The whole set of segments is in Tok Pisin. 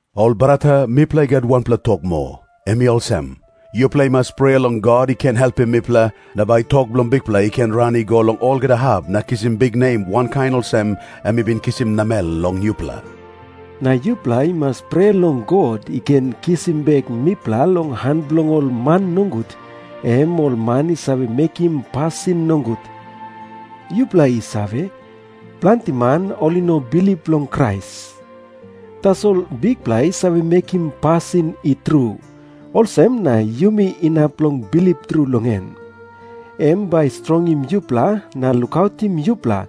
Ol brata, mipela i gat wanpela tok moa. Em i olsem. Yupela i mas prea long God i ken helpim mipela, na bai tok bilong Bikpela i ken ran i go long olgeta hap na kisim biknem wankain olsem em i bin kisim namel long yupela. Na yupela i mas prea long God i ken kisim bek mipela long han bilong ol man nogut, em ol man i save mekim pasin nogut. Yupela i save, planti man ol i no bilip long Krais. Tasol Bikpela i save mekim pasin i tru. Olsem na yumi inap long bilip tru long em. Em bai i strongim yupela na lukautim yupela,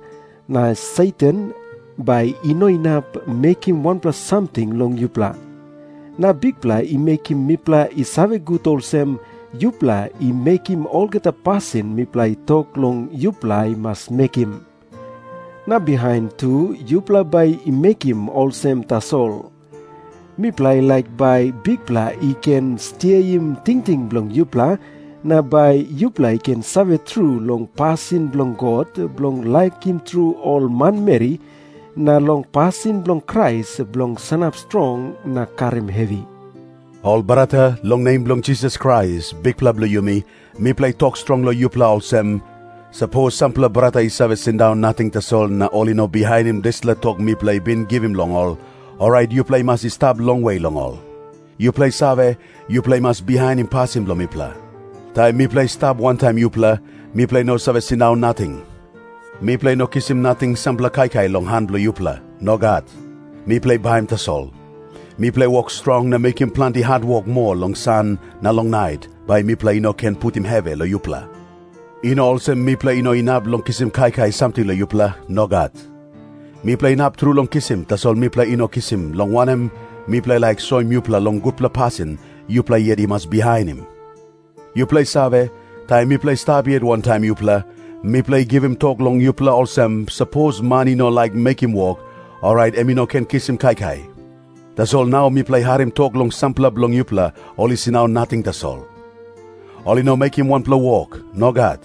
na Satan bai i no inap mekim wanpela samting long yupela. Na Bikpela i mekim mipela i save gut olsem, yupela i mekim olgeta pasin mipela i tok long yupela i mas mekim. Na bihain tu yupela bai i mekim olsem tasol. Mipela i laik bai Bikpela i ken stiaim tingting bilong yupela, na bai yupela i ken save tru long pasin bilong God bilong laikim tru ol manmeri, na long pasin bilong Krais bilong sanap strong na karim hevi. Ol brata, long nem bilong Jisas Krais, Bikpela bilong yumi, mipela i tok strong long yupela olsem, sapos sampela brata i save sindaun nating tasol na ol i no bihainim dispela tok mipela i bin givim long ol, orait yupela i mas i stap longwe long ol. Yupela i save, yupela i mas bihainim pasin bilong mipela. Taim mipela i stap wantaim yupela, mipela i no save sindaun nating. Mipela i no kisim nating sampela kaikai long han bilong yupela. Nogat. Mipela i baim tasol. Mipela i wok strong na mekim planti hatwok moa long san na long nait, bai mipela i no ken putim hevi long yupela. I no olsem mipela i no inap long kisim kaikai samting long yupela. Nogat. Mipela inap tru long kisim, tasol mipela i no kisim, long wanem, mipela i laik soim yupela long gutpela pasin yupela yet i mas bihainim. Yupela i save, taim mipela i stap yet wantaim yupela, mipela i givim tok long yupela olsem, sapos man i no laik mekim wok, orait em i no ken kisim kaikai. Tasol nau mipela i harim tok long sampela bilong yupela ol i sindaun nating tasol. Ol i no mekim wanpela wok. Nogat.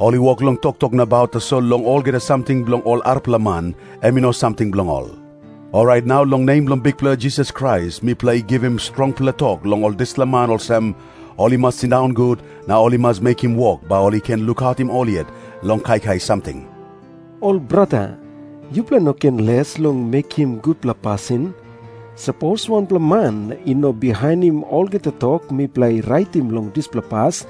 Ol i wok long toktok nabaut tasol long olgeta samting bilong ol arapela man, em i no samting bilong ol. Orait nau long nem bilong Bikpela Jisas Krais mipela i givim strongpela tok long ol dispela man olsem, ol i mas sindaun gut, na ol i mas mekim wok, bai ol i ken lukautim ol yet long kaikai samting. Ol brata, yupela i no ken les long mekim gutpela pasin. Sapos wanpela man i no bihainim olgeta tok mipela i raitim long dispela pas,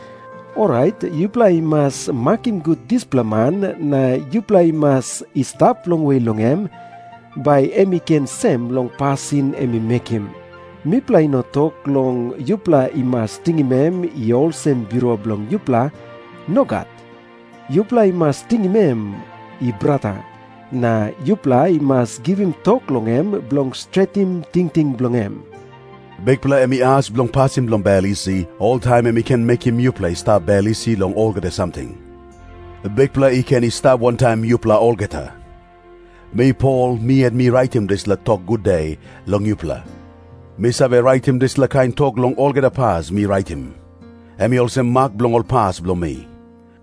orait yupela i mas makim gut dispela man na yupela i mas i stap longwe long em, bai em i ken sem long pasin em i mekim. Mipela i no tok long yupela i mas tingim em i olsem birua bilong yupela. Nogat. Yupela i mas tingim em i brata, na yupela i mas givim tok long em bilong stretim tingting bilong em. Bikpela, em i as bilong pasin bilong bel isi, oltaim em i ken mekim yupela i stap bel isi long olgeta samting. Bikpela i ken i stap wantaim yupela olgeta. Mi Pol mi yet mi raitim dispela tok gude long yupela. Mi save raitim dispela kain tok long olgeta pas mi raitim. Em i olsem mak bilong ol pas bilong mi.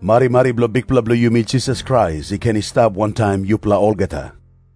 Marimari bilong Bikpela bilong yumi Jisas Krais i ken i stap wantaim yupela olgeta.